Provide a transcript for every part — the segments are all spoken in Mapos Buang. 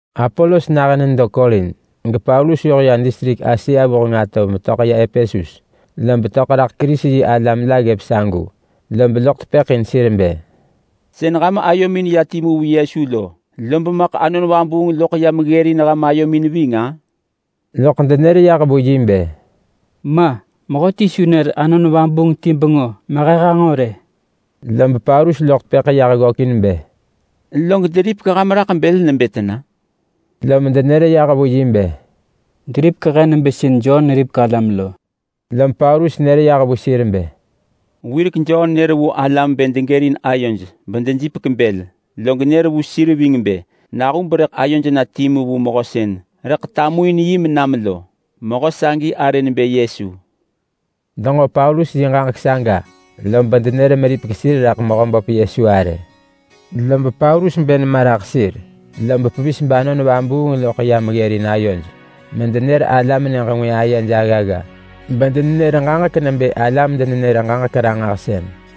Apolos nahën nedo Korint, gePaulus yoh ya distrik Asia vuheng atov metöḳ ya Epesus, lob töḳ raḳ Kerisi-yi-alam la ggëp sagu. Lob loḳ tepëḳ in sir bë, “Sën ham ayomin ya timu vu Yesu lo, lob maḳ Anon Vabuung loḳ yam ggërin ham ayomin ving-a?” Loḳ denër yah vu bë, “Ma! Mehöti su nër Anon Vabuung ti bengö mehe hanġo rë.” Lob Paulus loḳ tepëḳ yah ggökin bë, “Log deripek ham raḳ bël nebë tena?” Lom denër yah vu bë, “Deripek he nebë sën Jon neripek alam lo.” Lom Paulus nër yah bë, “Wirek Jon nër vu alam bë degërin ayoj bedejipek bël, log nër vu sir ving bë nahub rëḳ ayoj na timu vu mehö sën rëḳ tamuin yi menam lo. Mehö sagi arë nebë Yesu.” Denġo Paulus yi ġaġek saga lob denër meripek sir raḳ Mehöböp Yesu arë. Lob Paulus bë nema raḳ sir, lob pevis bAnon Vabuung loḳ yam ggërin ayoj medenër alam nyëġ ngwë ayej aggagga, bedenenër ġaġek nebë alam-denenër-ġaġek-ranġahsën.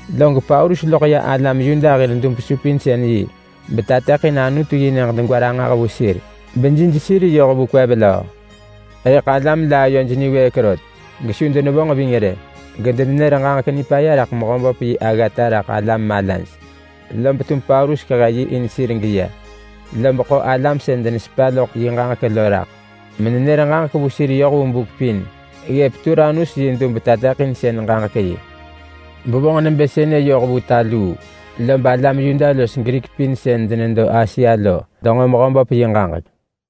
Log Paulus loḳ ya alam Yuda hir dub-supinsën-yi betateḳin Anutu-yi-nyëġ degwa ranġah vu sir bejij sir yoh vu kwev löö. Rëḳ alam la ayoj niwëëk rot gesu denevonġ ving rë. Gedenenër ġaġek nipaya raḳ Mehöböp yi aggata raḳ alam malaj. Lob tum Paulus kehe yi in sir geya, lob ḳo alam sën denesepa loḳ yi ġaġek lo raḳ menenër ġaġek vu sir yoh vu buk pin ggëp Turanus yi dub-tateḳinsën-ġaġek-yi. Bevonġ nebë sënë yoh vu ta luu, lob alam Yuda los Grik pin sën denedo Asia lo denġo Mehöböp yi ġaġek.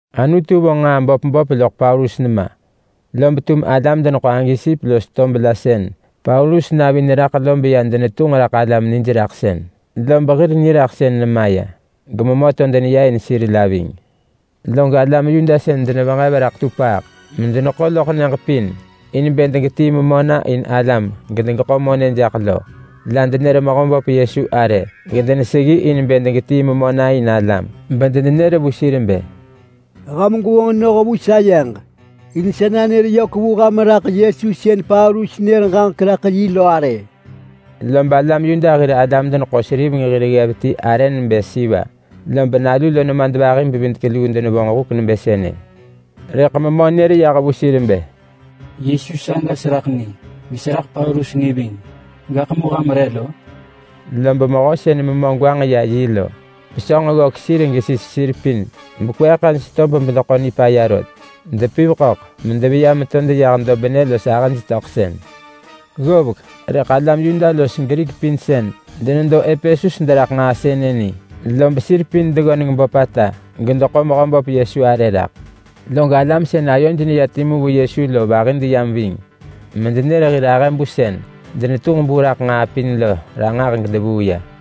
Anutu vonġ nġaa böp böp loḳ Paulus nema, lob tum alam deneḳo agesip los tob la sën Paulus navi neraḳ lo beya denetunġ raḳ alam nijraḳsën, lob hir niraḳsën nemaya. Gememö to deneya in sir la ving. Log alam Yuda sën denevenġev raḳ tupaaḳ medeneḳo loḳ nyëġ pin in bë degetii memö na in alam gedegeḳo monë jaḳ lo la denër Mehöböp Yesu arë gedeneseggi in bë degetii memö na in alam. Bedenenër bë, “Ham gwevonġ noh vu sayeġ in sa nanër vu honġ raḳ Yesu arë sën Paulus nër ġaġek raḳ yi lo!” Lob alam Yuda hir alam-deneḳo-seriveng hir ggev ti arë nebë Siva, lob nalu lo nemadvahi-bevidek-luu denevonġ huk nebë sënë. Rëḳ memö nër yah vu sir bë, “Yesu saga seraḳ ni. Geseraḳ Paulus ni ving. Gaḳ mu ham re lo?” Lob mehö sën memö negwanġ ya yi lo, pesönġ ggök sir gesis sir pin bekweeḳ hej tob bedeḳo nipaya rot, bedepiv ḳöḳ medeveya meto deyah dobnë los ahëj töḳsën. Ggovek rëḳ alam Yuda los Grik pin sën denedo Epesus deraḳ nġaa sënë ni, lob sir pin deggöneng böpata gedeḳo Mehöböp Yesu arë raḳ. Log alam sën ayoj neya timu vu Yesu lo vahi deyam ving medenër sën denetunġ bu raḳ nġaa pin lo ranġah gedevuu ya.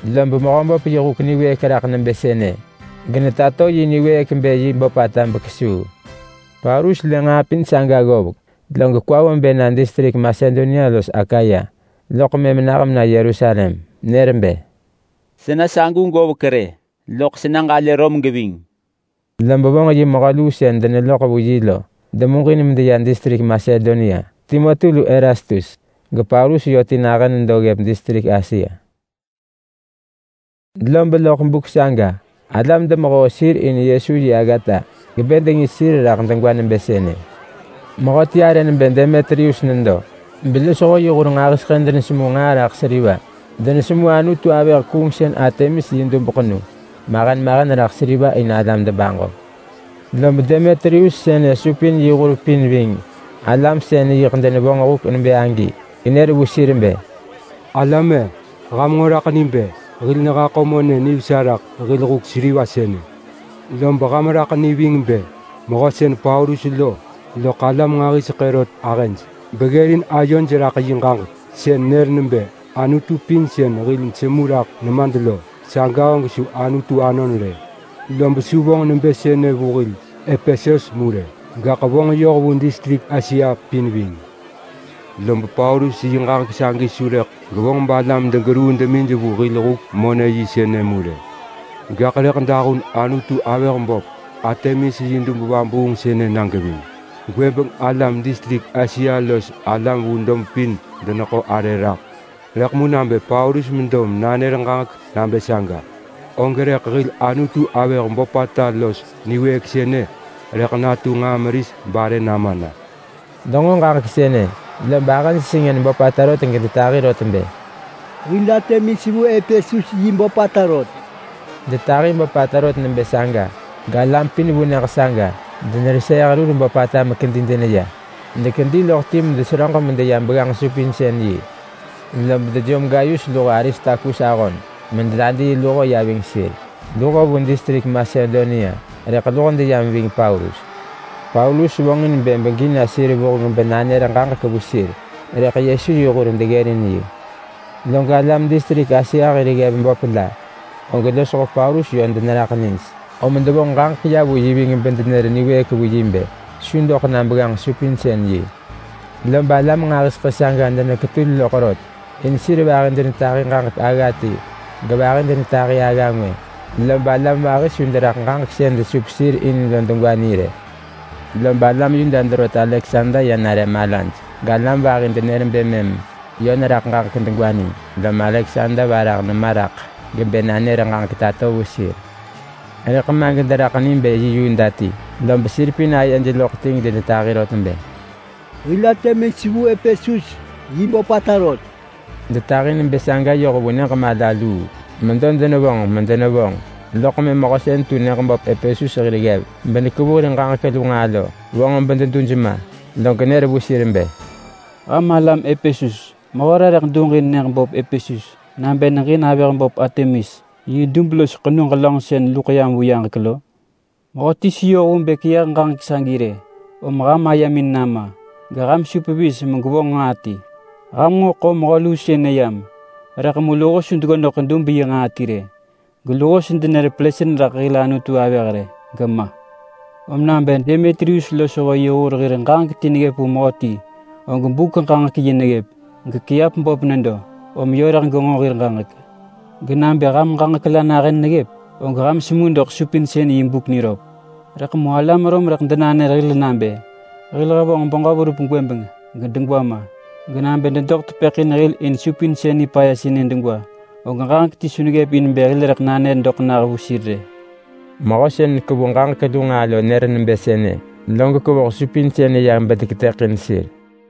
Lob Mehöböp yi huk niwëëk raḳ nebë sënë genetato yi niwëëk bë yi böpata bekesuu. Paulus lë nġaa pin saga ggovek, log kwa vo bë na distrik Masedonia los Akaya loḳ mëm nah mena Yerusalem. Nër bë, “Sena sagu govek rë, loḳ sena ġalë Rom geving.” Lob vonġ yi mehö luu sën deneloḳ vu yi lo demuġin medeya distrik Masedonia, Timoti lu Erastus. GePaulus yö ti nahën nedo ggëp distrik Asia. Lob loḳ buk saga, alam demehoo sir in Yesu yi aggata gebë dengis sir raḳ degwa nebë sënë: Mehöti arë nebë Demetrius nedo belosho yi hur nġahiseḳë denesemu nġaa raḳ seriva. Denesemu anutu-avëh-kuungsën Artemis yi dub ḳenu mahen mahen raḳ seriva in alam debaġo. Lob Demetrius sënë supin yi hur pin ving alam sën yiḳ denevonġ huk nebë agi genër vu sir bë, “Alam-e! Ham nġo raḳ ni bë hil nehaḳo monë nivesa raḳ hil huk seriva sënë. Lob ham raḳ ni ving nebë mehö sën Paulus lo loḳ alam nġahiseḳë rot ahëj, beggërin ayoj raḳ yi ġaġek sën nenër nebë anutu pin sën hil nesemu raḳ nemad lo, saga og su anutu anon rë. Lob su vonġ nebë sënë vu hil Epesus mu rë, gaḳ vonġ yoh vu distrik Asia pin ving. Lob Paulus yi ġaġek sagi su rëḳ gevonġ balam degeruu demij vu hil huk-monë-yi sënë mu rë. Gaḳ rëḳ dahun anutu-avëh böp Artemis yi dub vabuung sënë na geving. Gwëbeng alam distrik Asia los alam vu dob pin deneḳo arë raḳ, rëḳ mu nabë Paulus medo nanër ġaġek nabë saga, og rëḳ hil anutu-avëh böpata los niwëëk sënë rëḳ natu nġaa meris barë nama na.” Denġo ġaġek sënë lob ahëj sengën böpata rot gedetahi rot bë, “Hil Artemis vu Epesus yi böpata rot!” Detahi böpata rot nebë saga galam pin vu nyëġ saga dereseeh rur böpata mekedi deya. Dekedi loḳ ti medeseröġ medeya begganġ-supinsën-yi, lob dejom Gayus luho Aristarkus ahon mededadii luho ya ving sir. Luho vu distrik Masedonia rëḳ luho deyam ving Paulus. Paulus vonġin bë begi na sir vuheng benanër ġaġek vu sir, rëḳ Yesu yi hur deggërin yi. Log alam distrik Asia hir ggev böp la, og losho Paulus yö deneraḳ nij, om devonġ ġaġek ya vu yi ving bedenër niwëëk vu yi bë su doḳ na begganġ-supinsën-yi. Lob alam nġahiseḳë saga deneketul loḳ rot, in sir vahi denetahi ġaġek agga ti gevahi denetahi agga ngwë, lob alam vahi su deraḳ ġaġek sën desup sir in lo degwa ni rë. Lob alam Yuda derot Aleksander ya nare malaj galam vahi denër bë mëm yö neraḳ ġaġek degwa ni. Lom Aleksander varah nema raḳ gebë nanër ġaġek tato vu sir. Rëḳ ma gederaḳ ni bë yi Yuda ti, lob sir pin ayej loḳ ti gedenetahi rot bë, “Hil Artemis vu Epesus yi böpata rot!” Detahi nebë saga yoh vu nyëġ mala luu. Medo denevonġ medenevonġ, loḳ mëm mehö sën tu nyëġ böp Epesus hir ggev benekevu hir ġaġek lu nġaa lo vonġ bededuj ma, log nër vu sir bë, “Ham alam Epesus! Mehö re rëḳ duġin nyëġ böp Epesus nabë neġin avëh böp Artemis yi dub los ḳenu ġelönġ sën luḳ yam vu yaġek lo? Mehöti su yoh vu bë keyëh ġaġek sagi rë. Om ham ayemin nama, geham su pevis megwevonġ nġaa ti. Ham nġo ḳo mehö luu sënë yam, rëḳ mu luho su deggodeḳ dub yi nġaa ti rë. Geluho su denër pelësën raḳ hil anutu-avëh rë, gema! Om nabë Demetrius losho yi hur hir ġaġek ti neggëp vu mehöti, og buk-ġaġek-yi neggëp. Gekiap böp nedo. Om yö rëḳ genġo hir ġaġek. Genabë ham ġaġek la nahën neggëp, og ham semu doḳ supinsën yi buk niröp. Rëḳ mu alam Rom rëḳ denanër hil nabë hil hevonġ beġö verup gwëbeng gedegwa ma! Genabë dedoḳ tepëḳ in hil in supinsën nipaya sënë degwa, og ġaġek ti su neggëp in bë hil rëḳ nanër doḳ nah vu sir rë!” Mehö sën nekevu ġaġek lu nġaa lo nër nebë sënë, log kevoh supinsën ya bedeketëḳin sir.